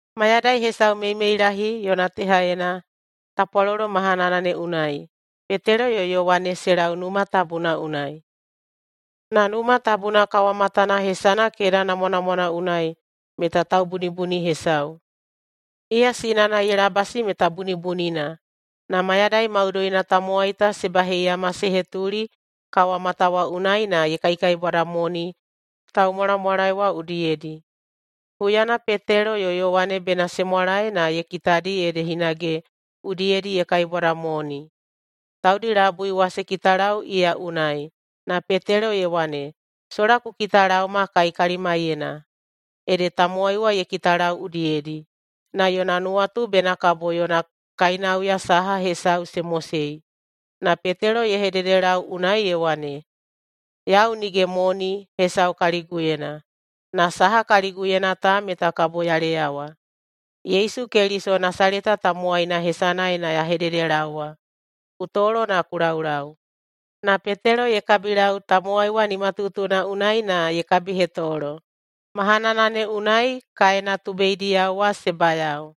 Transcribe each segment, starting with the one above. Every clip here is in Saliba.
Mayadai hesau meimeilahi yona tehaena tapwalolo mahanana ne unai Petelo yo Yowane se lau Numa Tabuna unai. Na Numa Tabuna kawamatana hesana “Keda Namwanamwana” unai meta taubunibuni hesau. Iya sinana ye labasi meta bunibunina, na mayadai maudoina tamowai ta se baheiyama se hetuli kawamata wa unai na ye kaikaibwadamoni taumwalamwalae wa udiyedi. Huyana Petelo yo Yowane bena se mwalae na ye kitadi ede hinage udiyedi ye kaibwadamoni. Taudi labui wa se kitalau iya unai, na Petelo ye wane, “Sola ku kitalaoma kai kalimaiyena.” Ede tamowai wa ye kitalau udiyedi, na yona nuwatu bena kabo yona kainauya saha hesau se mosei. Na Petelo ye hededelau unai ye wane, “Yau nige moni hesau kaliguyena, na saha kaliguyena ta meta kabo ya leyawa. Yesu Keliso Nasaleta tamowaina hesanaena ya hededelaowa, ku tolo na ku laulau.” Na Petelo ye kabilau tamowai wa nimatutuna unai na ye kabihetolo. Mahanana ne unai kaena tubeidiyao wa se bayao,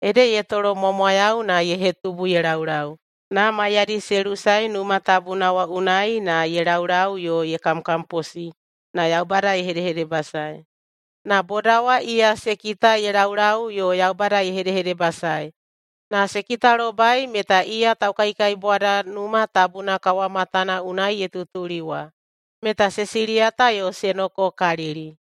ede ye tolomwamwayau na ye hetubu ye laulau. Na maiyadi se lusae Numa Tabuna wa unai na ye laulau yo ye kamkamposi na Yaubada ye hedehedebasae. Na boda wa iya se kita ye laulau yo Yaubada ye hedehedebasaei na se kitalobai meta iya taukaikaibwada Numa Tabuna kawamatana unai ye tutuli wa, meta se siliyata yo se nokokalili.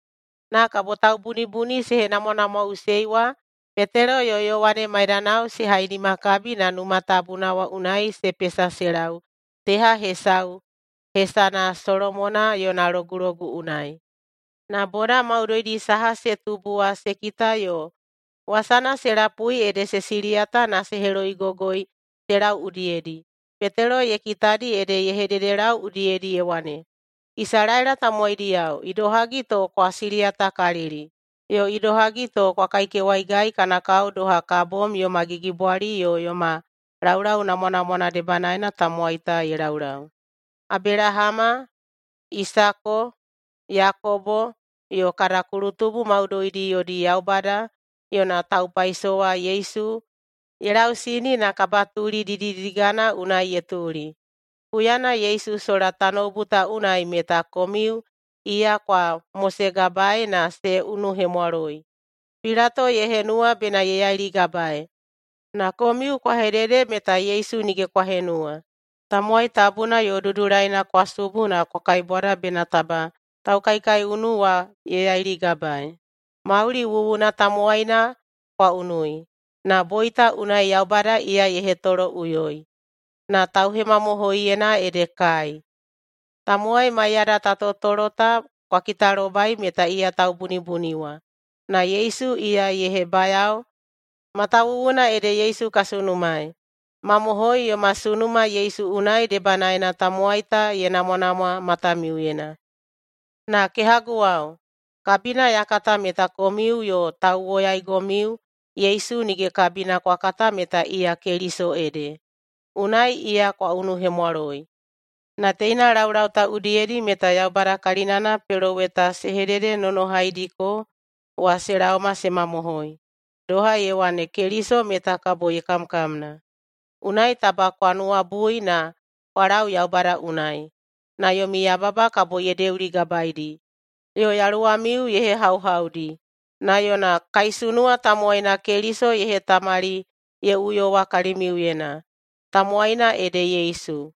Na kabo taubunibuni se henamwanamwaꞌusei wa Petelo yo Yowane maidanao se hainimakabi na Numa Tabuna wa unai se pesa se lau teha hesauna hesana “Solomona yona Logulogu” unai. Na boda maudoidi saha se tubu wa se kita yo wasana se lapui ede se siliyata na se heloigogoi se lau udiyedi. Petelo ye kitadi ede ye hededelau udiyedi ye wane, “Isalaela tamowaidiyao, idohagi to kwa siliyatakalili? Yo idohagi to kwa kaikewaigai kana kao doha ka bom yoma gigibwali yo yoma laulau namwanamwana debanaena tamowai ta ye laulau. Abelahama, Isako, Yakobo yo kada kulutubu maudoidi yodi Yaubada yona taupaisowa Yesu ye lausini [na kabatuli didididigana unai ye tuli.] Huyana Yesu sola tanoubu ta unai meta komiu iya kwa mosegabaei na se unuhemwaloi. Pilato ye henuwa bena ye yailigabaei, na komiu kwa hedede meta Yesu nige kwa henuwa. Tamowai tabuna yo dudulaina kwa subu na kwa kaibwada bena taba taukaikaiunu wa ye yailigabaei. Mauli wuwuna tamowaina kwa unui, na boita unai Yaubada iya ye hetoloꞌuyoi, na tauhemamohoiyena ede kai. Tamowai [maiyada ta totolo] ta kwa kitalobai meta iya taubunibuni wa. Na Yesu iya ye hebayao matawuwuna ede Yesu ka sunumaei. Mamohoi, yoma sunuma Yesu unai debanaena tamowai ta ye namwanamwa matamiuyena. Na kehaguwao, kabina ya kata meta komiu yo tauwoyaigomiu Yesu nige kabina kwa kata meta iya Keliso ede, unai iya kwa unuhemwaloi. Na teina laulau ta udiyedi meta Yaubada kalinana peloweta se hededenonohaidiko wa se laoma se mamohoi, doha ye wane Keliso meta kabo ye kamkamna. Unai taba kwa nuwabui na kwa lau Yaubada unai, na yomi yababa kabo ye deuligabaedi yo yaluwamiu ye hehauhaudi na yona kaisunuwa tamowaina Keliso ye hetamali ye uyowa kalimiuyena, tamowaina ede Yesu.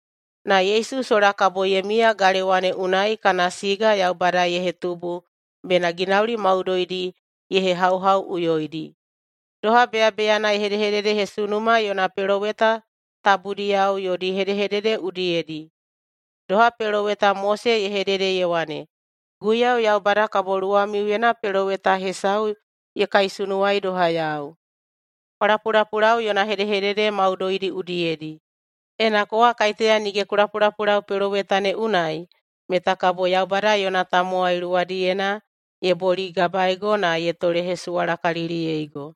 Na Yesu sola kabo ye miya galewa ne unai kana siga Yaubada ye hetubu bena ginauli maudoidi ye hehauhauꞌuyoidi, doha beyabeyana ye hedehededehesunuma yona peloweta tabudiyao yodi hedehedede udiyedi. Doha peloweta Mose ye hedede ye wane, ‘Guiyau Yaubada kabo luwamiuyena peloweta hesau ye kaisunuwai doha yau. Kwa lapulapulau yona hedehedede maudoidi udiyedi! Ena kowa kaiteya nige ku lapulapulau peloweta ne unai meta kabo Yaubada yona tamowai luwadiyena ye boligabaego na ye tolehesuwalakaliliyeigo.’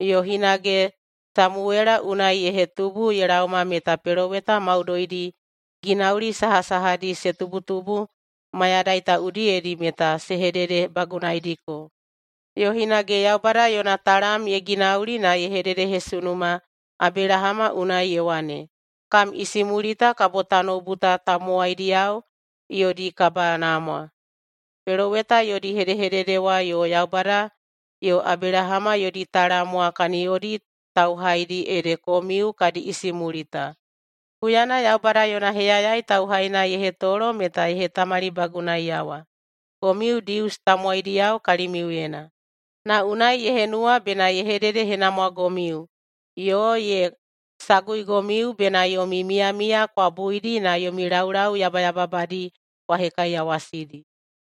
Yo hinage Samuwela unai ye hetubu ye laoma meta peloweta maudoidi ginauli sahasahadi se tubutubu mayadai ta udiyedi meta se hededebagunaidiko. Yo hinage Yaubada yona talam ye ginauli na ye hededehesunuma Abelahama unai ye wane, ‘Kam isimulita kabo tanoubu ta tamowaidiyao yodi kabanamwa.’Peloweta yodi hedehedede wa yo Yaubada yo Abelahama yodi talam wa kaniyodi tauhaidi ede komiu kadi isimulita. Huyana Yaubada yona heyayai tauhaina ye hetolo meta ye hetamalibagunaiyawa komiu Dius tamowaidiyao kalimiuyena, na unai ye henuwa bena ye hededehenamwagomiu yo ye saguigomiu bena yomi miyamiya kwa buidi na yomi laulau yabayababadi kwa hekaiyawasidi.”